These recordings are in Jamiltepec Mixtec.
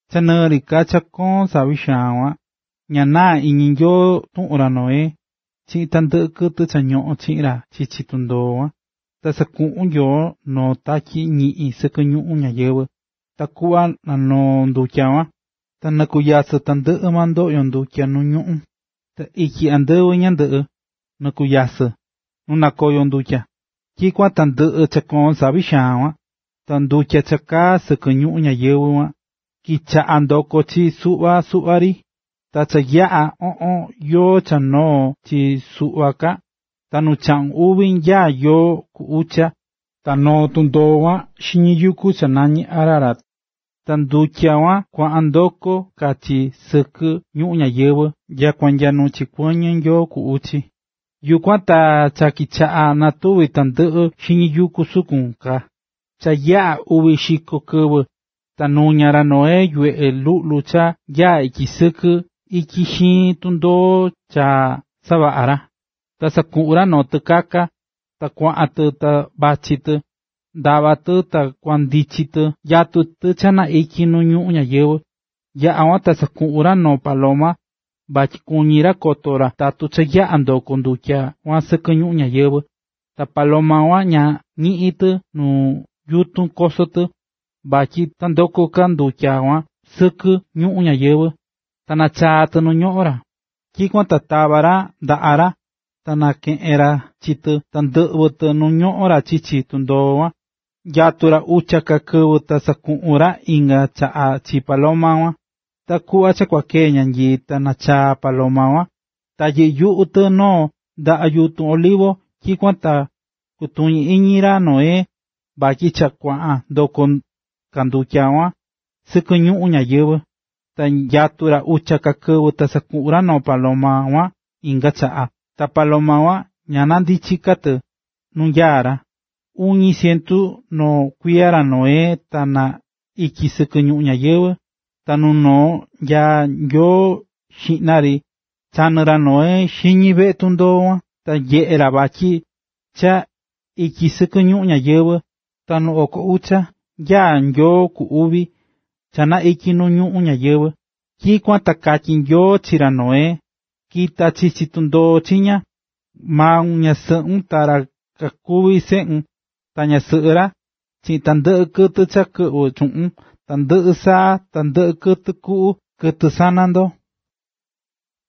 Cha nɨɨ ri ka cha koón savi xaan kuan, ña naá iñi Nyoo tuꞌun ra Noé, chiꞌin tandɨꞌɨ kɨtɨ cha ñoꞌón chiꞌin ra chichi tundoo kuan. Ta sakuꞌu̱n Nyoo noo tatyi ñiꞌin sɨkɨ ñuꞌún ñayɨvɨ̱, takuꞌva na nanoo ndutya kuan. Ta nɨkunyasɨ̱ tandɨꞌɨ maa ndoꞌyo ndutya nu ñuꞌún, ta ityi andɨvɨ ñandɨꞌɨ, nɨkunyasɨ̱ nu nakoyo ndutya, tyikuan ta ndɨꞌɨ̱ cha koón savi xaan kuan. Ta ndutya cha kaá sɨkɨ ñuꞌún ñayɨvɨ̱ kuan, kichaꞌa̱ ndokó chi suꞌva suꞌva ri, ta cha yaꞌa̱ oꞌon yoo cha noo̱ chi suꞌva ka. Ta nu chaꞌun uvi nya yoo ku ucha, ta noo̱ tundoo kuan xiñi yuku cha nañí Ararat. Ta ndutya kuan kuaꞌan ndokó ka chi sɨkɨ ñuꞌún ñayɨvɨ̱ nyakua nya nu chikuɨñɨ̱ yoo ku uchi, yukuan ta cha kichaꞌa̱ natuví tandɨꞌɨ xiñi yuku sukun ka. Cha yaꞌa̱ uvi xiko kɨvɨ, ta nuña̱ ra Noé yuveꞌe luꞌlu cha nyaá ityi sɨkɨ ityi xiin tundoo cha savaꞌa̱ ra. Ta sakuꞌu̱n ra noo tɨkaka, ta kuaꞌan tɨ ta vachí tɨ, ndavá tɨ ta kuandichi tɨ nyatú tɨ cha na ityi nu ñuꞌún ñayɨvɨ̱. Yaꞌa̱ kuan ta sakuꞌu̱n ra noo paloma, vatyi kuñí ra koto ra tatu cha yaꞌa̱ ndoko̱ ndutya kuan sɨkɨ ñuꞌún ñayɨvɨ̱. Ta paloma kuan ña ñiꞌi̱n tɨ nu yutun koso tɨ, vatyi ta ndoko ka ndutya kuan sɨkɨ ñuꞌún ñayɨvɨ̱, ta nachaa̱ tɨ nu ñoꞌón ra. Tyikuan ta tava̱ ra ndaꞌa ra, ta nakeꞌe̱n ra chi tɨ ta ndɨꞌvɨ̱ tɨ nu ñoꞌón ra chichi tundoo kuan. Nyatu̱ ra ucha ka kɨvɨ ta sakuꞌu̱n ra inga chaꞌa chi paloma kuan. Ta kuꞌva cha kua kee ñanyii ta nachaa̱ paloma kuan, ta yɨꞌɨ́ yuꞌu tɨ noo ndaꞌa yutun olivo. Tyikuan ta kutuñí iñi ra Noé, vatyi cha kuaꞌan ndokó ka ndutya kuan sɨkɨ ñuꞌún ñayɨvɨ̱ Ta nyatu̱ ra ucha ka kɨvɨ, ta sakuꞌu̱n ra paloma kuan inga chaꞌa, ta paloma kuan ña ndichi̱ ka tɨ nu nyaá ra. Iñu cientu noo kuiya ra Noé ta na ityi̱ sɨkɨ ñuꞌún ñayɨvɨ̱. Ta nu noo nyaá yoo xiꞌna ri chanɨ̱ ra Noé xiñi veꞌe tundoo kuan, ta nyeꞌe̱ ra vatyi cha ityi sɨkɨ ñuꞌún ñayɨvɨ̱. Ta nu oko ucha nyaá yoo ku uvi, cha na ityi̱ nu ñuꞌún ñayɨvɨ̱. Tyikuan ta katyí Nyoo chi ra Noé: “Ki̱ta chichi tundoo chiña, maun, ñasɨꞌun, ta ra kakuví seꞌun ta ñasɨꞌɨ ra, chiꞌin tandɨꞌɨ kɨtɨ cha kɨꞌvɨ̱ chuꞌun: tandɨꞌɨ saa, ta tandɨꞌɨ kɨtɨ kuꞌu, kɨtɨ sana ndo,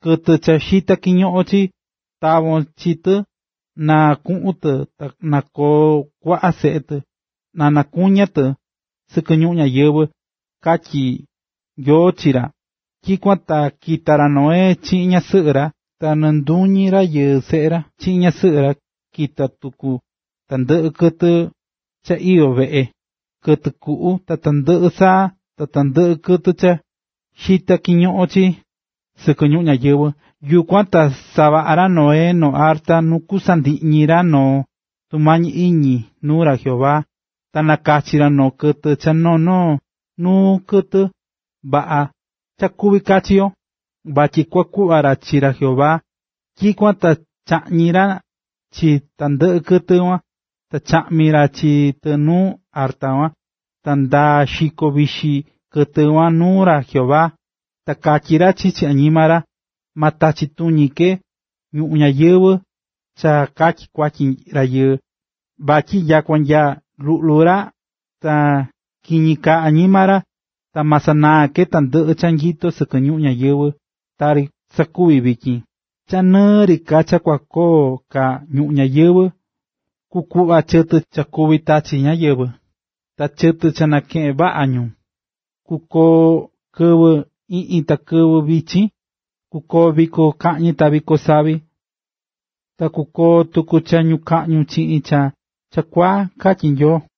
kɨtɨ cha xitá kiñoꞌon chii, tavon chi tɨ na kuꞌun tɨ ta na koo kuaꞌa seꞌe tɨ, na nakuña tɨ sɨkɨ ñuꞌún ñayɨvɨ̱”, katyí Nyoo chi ra. Tyikuan ta kita̱ ra Noé chiꞌin ñasɨꞌɨ ra, ta nɨɨ nduñi rayɨɨ seꞌe ra chiꞌin ñasɨꞌɨ ra. Kita̱ tuku tandɨꞌɨ kɨtɨ cha iyó veꞌe, kɨtɨ kuꞌu, ta tandɨꞌɨ saa, ta tandɨꞌɨ kɨtɨ cha xitá kiñoꞌon chii sɨkɨ ñuꞌún ñayɨvɨ̱. Yukuan ta savaꞌa̱ ra Noé noo arta nu kusandiꞌñi ra noo tumañi iñi nuu ra Jehová, ta nakachi̱ ra noo kɨtɨ cha noo noo nuu kɨtɨ vaꞌa cha kuví kachi yo, vatyi kua kuꞌva ra chi ra Jehová. Tyikuan ta chaꞌñi̱ ra chi tandɨꞌɨ kɨtɨ kuan, ta chaꞌmi̱ ra chi tɨ nuu arta kuan. Ta ndaá xiko vixi kɨtɨ kuan nuu ra Jehová, ta katyí ra chichi añima ra: “Ma tachi tuñi ke ñuꞌún ñayɨvɨ̱ cha katyi kuatyi rayɨɨ, vatyi nyakua nya luꞌlu ra ta kiñi kaá añima ra. Ta ma sanaa ke tandɨꞌɨ cha nyitó sɨkɨ ñuꞌún ñayɨvɨ̱ tari sakuvi̱ vityin. ”Cha nɨɨ ri ka cha kukoo ka ñuꞌún ñayɨvɨ̱, kukuꞌva chi chɨtɨ cha kuví tachi ñáyɨvɨ, ta chɨtɨ cha nakeꞌen vaꞌa ñu; kukoo kɨvɨ iꞌñi ta kɨvɨ vichin kukoo viko kaꞌñi ta viko savi ta kukoo tuku cha ñukaꞌñu chiꞌin cha chakuaa”, katyí Nyoo.